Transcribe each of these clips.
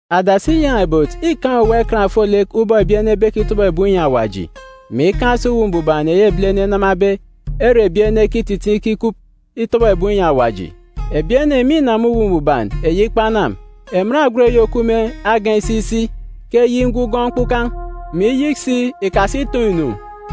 Adasi inyan̄a-ibot îkaan̄ owuwa ikan ofolek ubọk ebi ene ebekitọbọ ebum inyi Awaji, mè ikaan̄ si Uwu Mbuban eyi ebilene enamabe, ere ebi ene ekititiin̄ ikikup itọbọ ebum inyi Awaji. Ebi ene mînama Akpatan̄ Mbuban. Emen agwut eyi òkup me agan̄ isi isi ke eyik ngugọọn̄ mkpukan̄, mè iyik si ikasi itoon̄-inu,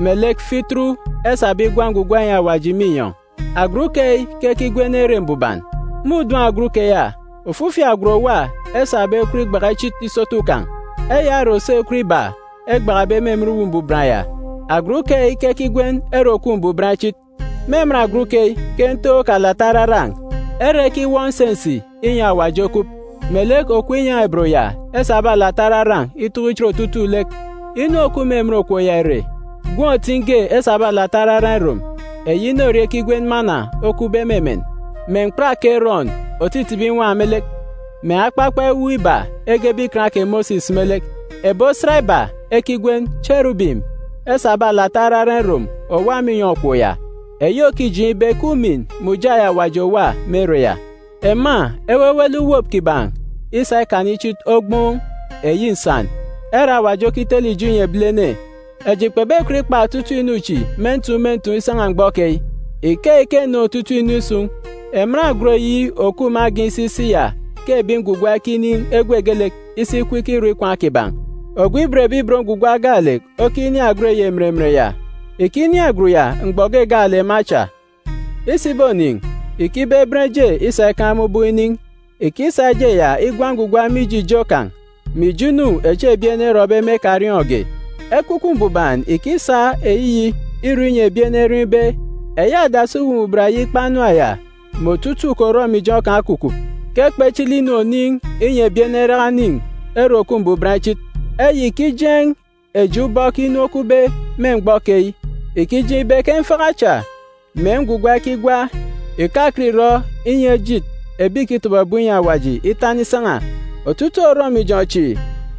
melek fituru esabe igwa ngwugwa inyi Awaji me inyọn̄. Agwut keyi ke ekigwen Ere Mbuban. Me udun̄ agwut keya, ofifi agwut òwa esabe ekwut igbaka ichit isotu kan̄. Eya ore òso ekwut iba egbakabe me emen Uwu Mbuban ya. Agwut keyi ke ekigwen Ere Òkup Mbuban Ichit. Me emen agwut keyi ke ntook alata araran̄, ere ekiwọp nsensi inyi Awaji okup, melek okop inyan̄a-ibot ya esabe alata araran̄ itọkọ ichit otutuuk lek. Inu òkup me emen okop ya ìre, gwun̄ otin̄ ge esabe alata araran̄ irom, eyi mana okupbe me emen, mè mkpat kè Erọn òtitibi inwan̄ me lek, mè akpakpa ewuuk iba egebe Ikan kè Mosis me lek. Ebi mbem emen inyọn̄ iba esabe alata araran̄ irom òwa me inyọn̄ okop ya, eyi òkijeen̄ ibe ke ujamgbugbo Awaji òwa me ere ya. Ema ewewele uwop kiban̄ isa ikana ichit ogboon̄ nsan ere Awaji okitele ijo inyi ebilene. Eji kpebekọt ikpa otutuuk inu chi me ntuun̄ me ntuun̄ isan̄a mgbọ keyi. Ikeyi ke eneen̄ otutuuk inu isun̄. Emen agwut eyi òkup me agan̄ isi isi ya ke ebi ngwugwa ekinin̄ egwe geelek isi ikup ikirọ ikwaan̄ kiban̄. Ogwu òban Awaji gaalek okinin̄ agwut eyi emen emen ya. Ìkinin̄ agwut ya mgbọ ge gaalek me acha. Isibonin̄, ìkibeben eje isa ikaan̄ me ubọk inin̄. Ìkisa eje ya igwa ngwugwa mije ijo kan̄, mè ijo inu echi ebi ene erọbe me ekariọọn̄ge. Ekwukwu Mbuban ìkisa eyiyi irọ inyi ebi ene eriọọn̄ ibe, eyi adasi Atanga Chinichini ya mè otutuuk orọmijọn̄ kan̄ okukup, ke kpechili-nu oniin̄ inyi ebi ene eraka enin̄ Ere Òkup Mbuban Ichit. Eyi ìkijeen̄ eji ubọk inu okupbe me mgbọ keyi. Ìkijeen̄ ibe ke mfaka cha, mè ngwugwa ekigwa ìkakọt ìrọ inyi ejit ebi ìkitọbọ ebum inyi Awaji itana isan̄a. Otutuuk orọmijọn̄ chi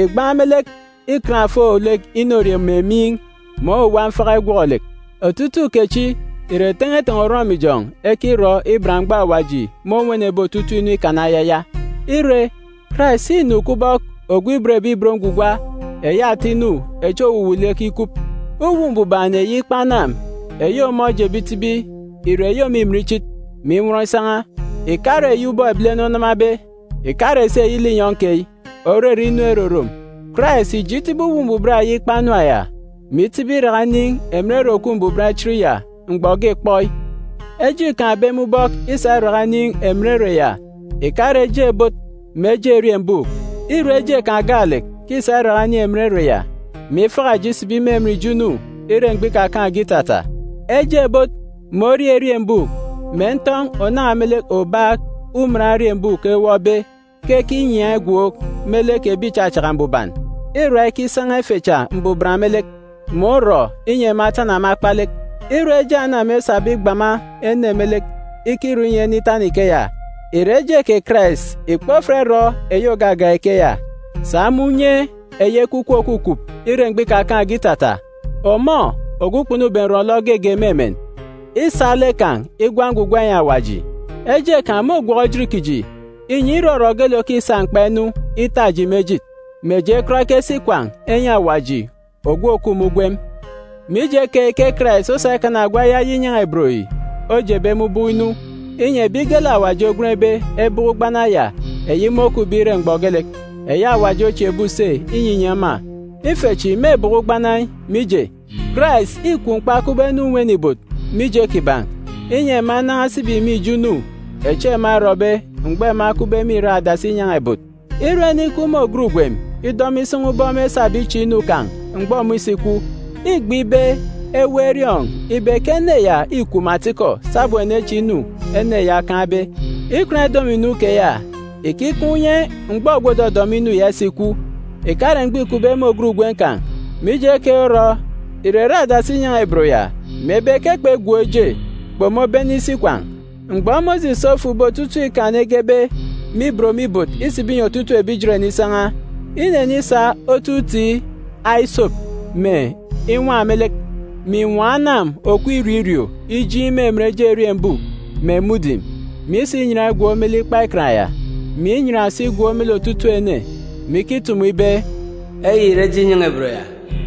ìgbaan̄ me lek ikan ofolek inorie mè miin̄, mè owuwa mfaka igwọk-lek. Otutuuk kechi ìre ten̄eten̄e orọmijọn̄ echi ekirọ iban mgbọ Awaji mônwenebe otutuuk inu ikana ayaya. Ire, Karais înu kubọk ogwu òban Awaji eyi ata inu echi òwuwuuk lek ikup. Uwu Mbuban eyi ikpa anam eyi ọmọ ojebe itibi ìre eyi òmimin ichit, mè inwọn isan̄a. Ìkare eyi ubọk ebilene onamabe, ìkare si eyi linyọn̄ keyi, òrere inu erorom. Karais ìje itibi Atanga Chinichini ya, mè itibi iraka inin̄ emen Ere Òkup Mbuban Ichit ya mgbọ ge kpọi. Eje îkaan̄be me ubọk isa iraka inin̄ emen ere ya ìkare eje ebot mè eje eriembuuk. Îre eje kan̄ gaalek ke îsa iraka inin̄ emen ere ya, mè ifaka eji isibi me emen ijo inu ire mgbọ ikakaan̄ge itata. Eje ebot mè eje orie eriembuuk, mè ntọn̄ ònan̄a me lek obaak uman eriembuuk ewọpbe, ke ekinyiaan̄ igwook me lek ebi ìchachaka mbuban, îra ikisan̄a ife cha mbuban me lek, mè orọ inyi ema etana me akpalek. Ire eje anam esabe igbama ene lek ikirọ inyi ene itana ikeya, ìre eje kè Karais ìkpofat irọ eyi ògagak ikeya? Sa me unye eyi Ekwukwu òkukup ire mgbọ ikakaan̄ge itata, ọmọ, ogwu kpunube nrọ-nlọ geege me emen, îsa lek kan̄ igwa ngwugwa inyi Awaji. Eje kan̄ môgwọk ejit kiji, inyi irọrọ geelek òkisa mkpa inu ita eji me ejit, mè eji ekọt ekesi ikwaan̄ enyi Awaji ogwu òkup me ugwem. Mije keyi ke Karais osa ikana ogwu ayaya inyan̄a-ibot yi ojebe me ubọk inu, inyi ebi geelek Awaji ogwenbe ebọkọ ugbana ya eyi môkupbe ire mgbọ geelek, eyi Awaji ochieekbe use inyinyi ema. Ife chi mêbọkọ ugbana yi, mije, Karais îkwu mkpa kubọk ene inwene ibot mije kiban̄, inyi ema enan̄a esibi me ijo inu echi ema erọbe mgbọ ema ekupbe me irak adasi inyan̄a-ibot. Ire ene ikup me ògat ugwem idọmọ isan̄a ubọk mêsabe iche inu kan̄ mgbọ ọmọ isikwu, îgbe ibe eweek eriọọn̄ ibe ke ene ya îkwu me atikọ sabum èneche inu ene ya okaan̄be. Ikan idọmọ-inu keya ìkikaan̄ unye mgbọ ogwu òdọdọmọ inu ya isikwu, ìkare mgbọ îkupbe me ògat ugwem kan̄. Mije keyi orọ, ìrere adasi inyan̄a-ibot ya, mebe ke kpegwook eje, kpomobene isi ikwaan̄. Mgbọ Mosis ofukbe otutuuk Ikan egebe me ibot me ibot isibi inyi otutuuk ebi Ijeren isan̄a, inenisa otu mbubet isop mè inwan̄ me lek, mè inwọọn̄ anam òkup irio irio ijiin̄ me emen eje eriembuuk mè mudim, mè isa inyan igwook me lek Ikpa Ikan ya, mè inyan si igwook me lek otutuuk ene, mè ikitumu ibe, “Eyi ìre eje inyan̄a-ibot ya,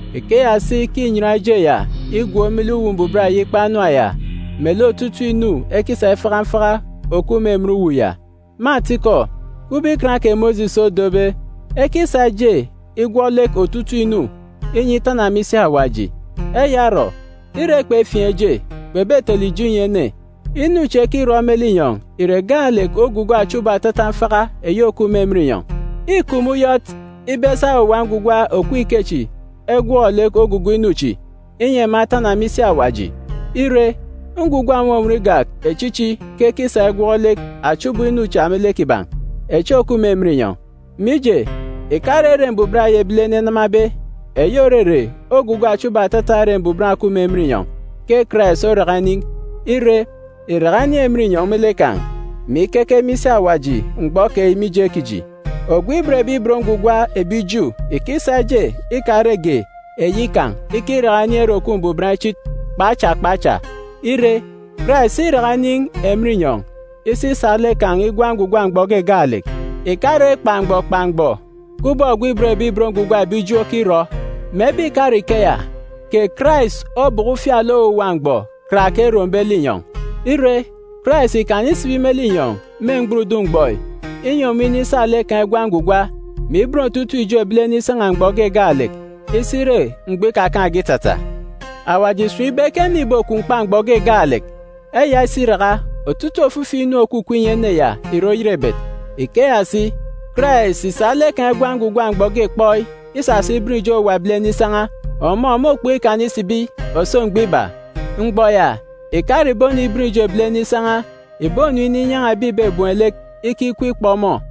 Ikeya si ke înyan eje ya igwook me lek Atanga Chinichini ya, melek otutuuk inu ekisa ifaka mfaka òkup me emen uwu ya. Me atikọ, kubọk Ikan kè Mosis odobe, ekisa eje igwọk lek otutuuk inu, inyi itana me isi Awaji. Eya orọ, ire kpefiin̄ eje, kpebetele ijo inyi ene. Inu chi ekirọ me linyọn̄ ìre gaalek ogugo achubọk atata mfaka eyi òkup me emen inyọn̄. Îkup me uyọt ibe esa owuwa ngwugwa òkup ikechi egwọk lek ogugo inu chi, inyi ema etana me isi Awaji. Ire, ngwugwa ònwọnwọn igak echichi ke ekisa igwọk lek achubọk inu cha me lek kiban̄, echi òkup me emen inyọn̄. Mije, ìkare Ere Mbuban eyi ebilene enamabe, eyi òrere ogugo achubọk atata Ere Mbuban òkup me emen inyọn̄ ke Karais oraka inin̄. Ire, ìraka inin̄ emen inyọn̄ me lek kan̄, mè ikeke me isi Awaji mgbọ keyi mije kiji. Ogwu òban Awaji ebi Ju ìkisa eje ikarege eyi kan̄ ikiraka inin̄ Ere Òkup Mbuban Ichit kpa acha kpa acha. Ire, Karais ìraka inin̄ emen inyọn̄ isi isa lek kan̄ igwa ngwugwa mgbọ ge gaalek, ìkare kpa mgbọ kpa mgbọ, kubọk ogwu òban Awaji ebi Ju okirọ. Mebe ìkare ikeya, kè Karais obọkọ ufialek owuwa mgbọ karake erombe linyọn̄. Ire, Karais ìkana isibi me linyọn̄ me mgburudun̄ mgbọ yi, inyi ọmọ inisa lek kan̄ igwa ngwugwa, mè iben otutuuk ijo ebilene isan̄a mgbọ ge gaalek iso ire mgbọ ikakaan̄ge itata. Awaji ìsun̄ ibe ke ene ìbokwu mkpa mgbọ ge gaalek. Eya isiraka, otutuuk ofifi inu òkukup inyi ene ya ìre oyerebet. Ikeya si, Karais ìsa lek kan̄ igwa ngwugwa mgbọ ge kpọi isasa iben ijo owuwa ebilene isan̄a. Ọmọ môkpọk ikana isibi òso mgbọ iba. Mgbọ ya, ìkare ìboniben ijo ebilene isan̄a. Ìbonu ininyan̄a ebi ìbebem lek ikikweek ikpọ ọmọ.